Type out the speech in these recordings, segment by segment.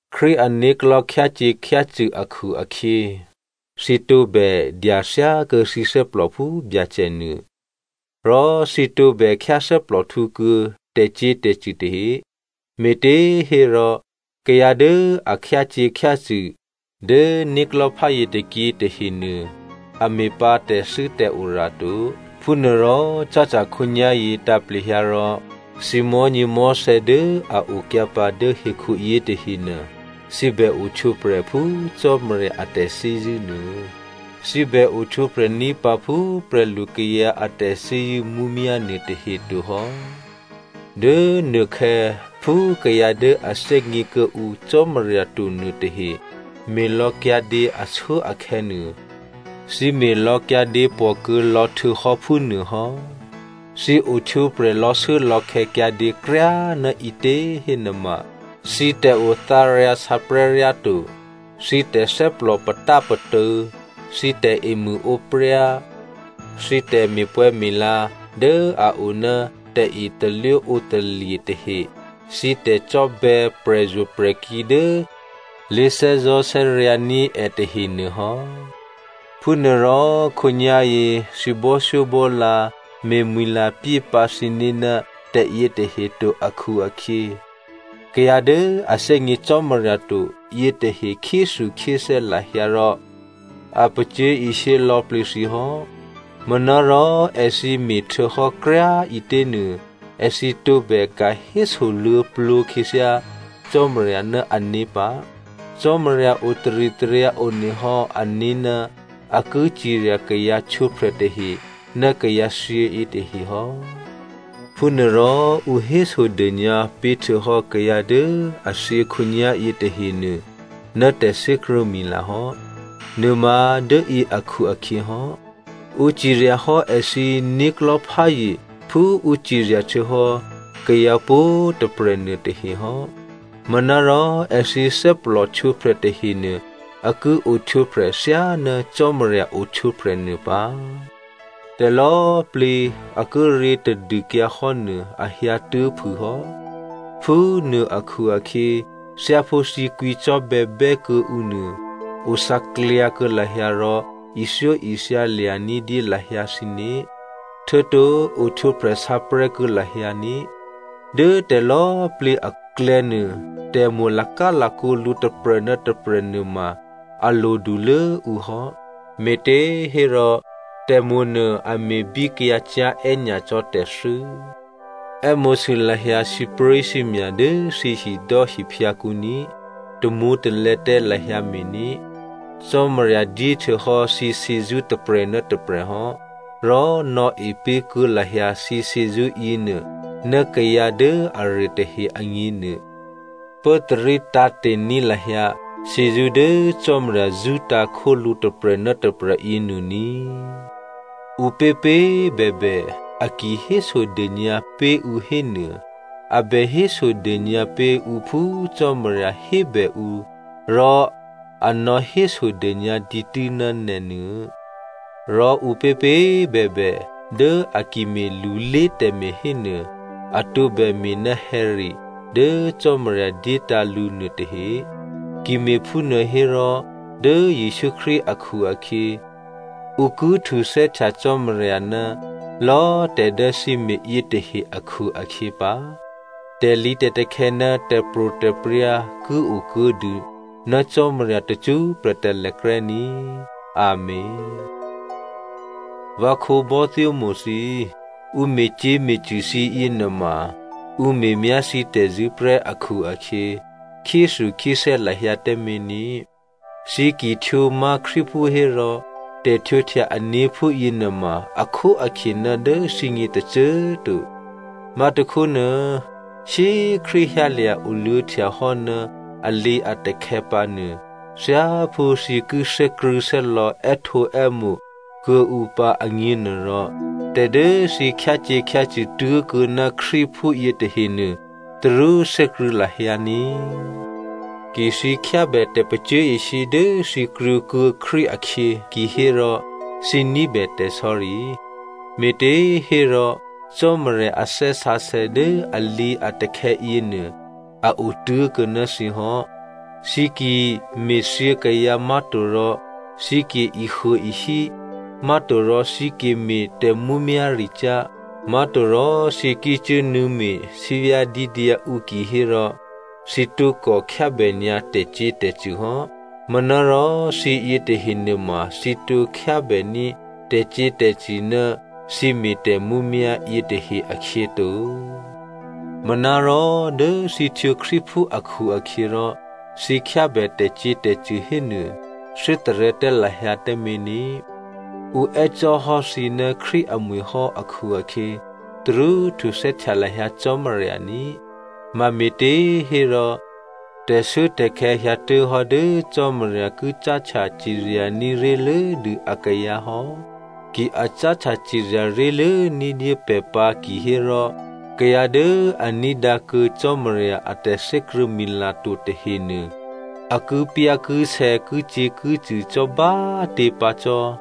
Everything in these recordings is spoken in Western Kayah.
Krístu ané̤klò̤́ khyácyě̤khyácṳ̂ akhu-akhyě, thǐ tǒbè dyathyákuô̌ thǐ thè́plò phú Byacè nuô, rò thǐ tǒbè khyáthè́plòhtǔ kuô̌ tè̤cyě̤tè̤cṳ̂ tahe, me̤těhérò, kayǎ dố a khyácyě̤khyácṳ̂ dố né̤klò̤́ pházye tôkyě tahenuô, a me̤ pǎ tè̤thû́tè̤ora to. Phúnuôrò cáhtya khǒnyá̤yě tǎ̤plehyǎ rò, thǐ mò̤́nyěmò̤́thè̌ dố a okyǎpǎ dố hekhuyě tahenuô thǐ bè ohtwǒprè̤ phú Cò́marya a tè̤thè́zṳ̂́ nuô. Thǐ bè ohtwǒprè̤ ní̤ pǎ phú prè̤lukayǎ a tè̤thè́zṳ̂́ mǔmyá̤ nuôtahe tohò́. Dố nuôkhè̌, phú kayǎ dố a thè́gně kuô̌ǔ Cò́marya to nuôtahe me̤lò̌kyǎdě ashuốakhè̌nuô thǐ me̤ lò̌kyǎdě pòkuô̌ lò̌ htuô̌hò́ phúnuôhò́. Thǐ ohtwǒprè̤ lò̌shuốlò̌khè̌ kyǎdě kryá꤮ ná ǐtě hénuôma, thǐ tè̤othǎryǎsǎprè̤́ ryáto, thǐ tè̤thè́plò patápatô̌, thǐ tè̤emṳ̂ǒpryá, thǐ tè̤me̤pwè̌me̤la dố a oná tè̤etalwóǒtalye̤ tahe, thǐ tè̤cò́bè̌ prè̤zo̤prè̤kí̤ dố lé̤thè́zò̤́thè́ryǎ̤ ní̤ è tahenuô hò́. Phúnuôrò khǒnyá̤yě thǐ bò́thyóbò́lǎ me̤mwi̤lapyé pǎ thǐné̤ ná tè̤yětahe to akhu-akhyě, kayǎ dố a thè́gně Cò́marya to yětahe khyéthukhyéthè́ lahyǎ rò a pacyé̤ishyé lò̌plǐ thǐ hò́. Manárò èthǐ me̤htuô̌hò́ kryá꤮ ǐtěnuô, èthǐ tǒbè ka̤ hésoluô̌plǒ khyěthyá Cò́marya ná ané̤ pǎ. Cò́marya o taritaryǎ one hò́ ané̤ ná a ki cirya kayǎ htwǒprè̤ tahe ná kayǎthyě yětahe hò́. Phúnuôrò ǔ hésodônyǎ pé̤htuô̌hò́ kayǎ dố a thyě khǒnyá̤yě tahenuô ná tè̤thè́krṳ̂̌mila hò́ nuôma dốyě akhu-akhyě hò́. Ǔ ciryahò́ èthǐ né̤klò̤́pházye phú ǔ cirya htuô̌hò́ kayǎ pwǒ̤꤮ tôprè̤ nuôtahehò́. Manárò èthǐ thè́plòhtwǒprè̤ tahenuô a ki ohtwǒprè̤ thyáná Cò́marya ohtwǒprè̤ nuô pǎ. Tè̤lò̌꤮ plǐ a kíré̤ tadûkyǎhò́ nuô a hyǎtuố̤ phûhò́. Phúnuô akhu-akhyě thyáphú thǐ kwǐcò́bè̌bè́ kuô̌ǔ nuô, othǎklyǎ kuô̌ lahyǎ rò ithyóithya lya̤ ní̤dyé lahyǎ thǐné̤, htuô̌to ohtwǒprè̤ sǎprè̤́ kuô̌ lahyǎ ní꤮. Dố tè̤lò̌꤮ plǐ aklè̌nuô, tè̤mo̤ lakálakǒ lǔ tôprè̤ ná tôprè̤ nuôma a lodulố ǔ hò́, me̤těhérò tè̤mo̤nuô a me̤bíkyǎcyá̤ è́nyacò́ tè̤thû́. È́mo̤sû lahyǎ sǐpré̤sǐmya̤ dố thǐhidò́ hiphyǎkǔ ní꤮, tamwǒ̤talè̌ tǎ lahyǎ mé̤ ní꤮. Cò́marya dyéhtuô̌hò́ thǐ shyězṳ́ tôprè̤ ná tôprè̤hò́, rò nò̌e pé̤kuô̌ lahyǎ thǐ shyězṳ́ yěnuô ná kayǎ dố aruô tahe agně nuô. Pốtarí tǎ̤te̤ní̤ lahyǎ shyězṳ́ dố Cò́marya zṳ́tǎ̤ khólǔ tôprè̤ ná tôprè̤ yěnuô ní꤮. Ǔpěpě꤮ bèbè, a ki hésodônyǎ pé̤ ǔ hénuô, a bè hésodônyǎ pé̤ ǔ phú Cò́marya hébè ǔ rò a nò̌hésodônyǎ dǐtû́ ná nè̤nuô, rò ǔpěpě꤮ bèbè dố a ki me̤lulé tè̤me̤ hénuô, a tǒbè me̤ ná hè̌re dố Cò́marya dyétǎ̤ lǔ nuôtahe. Ki me̤phúnuô hérò, dố Jesǔ Krístu akhu-akhyě, ǔ ki htuthè́htya Cò́marya ná lò̌ tè̤ dố thǐ me̤ yětahe akhu-akhyě pǎ. Tè̤lǐtè̤takhè̌ ná tè̤pro̤tè̤prya̤ ki okuô̌ dû ná Cò́marya tacṳ́prè̤ talèkrè́ ní꤮ Amèn. Vǎ khǒbò́thyómo̤ thǐ꤮, ǔ me̤cyě̤me̤cṳ̂ thǐ yěnuôma ǔ me̤myá thǐ tè̤zṳ̂́ prè́ akhu-akhyě, khyéthukhyéthè́ lahyǎ tǎmé̤ ní꤮. Thǐ ki htwǒmá̤ Krístuphú hérò, tè̤htwǒhtya ané̤ phúyě nuôma akhóakhye ná dố thǐgně tôcô꤮ to. Má̤tôkhónuô, shyé꤮ Krístu hyǎlya̤ oluô̌htya hò́ ná alǐatakhè̌ pǎnuô, thyáphú thǐ ki thè́krṳ̂̌thè́lò̌ è́htǒè́mo̤ kuô̌ǔ pǎ agně nuôrò, tè̤ dố thǐ khyácyě̤khyácṳ̂ tố̤kuô̌ ná Krístu phúyě tahenuô tarú thè́krṳ̂̌ lahyǎ ní꤮. Ki thǐ khyábè tè̤pacyé̤ishyé dố thǐ krwǒkuô̌ Krístu akhyě kihérò thǐ ní̤bè tè̤sò̌ri, me̤těhérò Cò́marya a Thè́ Sǎsè̌ dố alǐatakhè̌ yěnuô, a otố̤kuô̌ ná thǐ hò́. Thǐ ki me̤thyě kayǎ, má̤torò thǐ ki ehuôehí, má̤torò thǐ ki me̤ tè̤mǔmyá̤ricyá̤, má̤torò thǐ ki cuốnuô̌me̤ sǐvyá̤dídyǎ ǔ kihérò thǐ tǒkò khyábènyǎ tè̤cyě̤tè̤cṳ̂ hò́. Manárò thǐ yětahe nuôma thǐ tǒ khyábèní̤ tè̤cyě̤tè̤cṳ̂ ná thǐ me̤ tè̤mǔmyá̤ yětahe akhyě to. Manárò dố thǐ htwǒ Krístuphú akhu-akhyěrò thǐ khyábè tè̤cyě̤tè̤cṳ̂ hénuô, thè́tarè̤̌ tǎ lahyǎ tǎmé̤ ní꤮, ǔ è́cò́ hò́ thǐ ná Krístu amwi̤ hò́ akhu-akhyě tarú htuthè́htya lahyǎ Cò́marya ní꤮. Mame̤těhérò, tè̤shuốtè̤khè̌ hyǎtuố̤hò́ dố Cò́marya ki cáhtya ciryaní̤ ré̤lốdû akayǎ hò́. Ki a cáhtya cirya ré̤lố ní̤dyé pè̤ pǎ kihérò kayǎ dố a ní̤dǎ kuô̌ Cò́marya a tè̤thè́krṳ̂̌mila to tahenuô a kipyá̤kisè̌ kicyě̤kicṳ̂ cò́ bá꤮ tě pǎ cò́.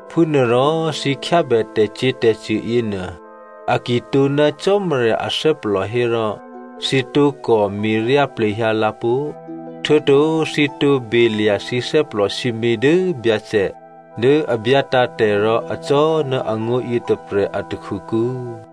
Phúnuôrò, thǐ khyábè tè̤cyě̤tè̤cṳ̂ yěnuô, a ki tǒ ná Cò́marya athè́plò hérò, thǐ tǒkò me̤ryá plehyǎ lǎpó̤, htuô̌to thǐ tǒ belya̤ thǐ thè́plò sǐmě dố Byacè dố a byátǎ̤ tè̤ rò acò́ ná angó̤ yětôprè̤ a takhukǔ.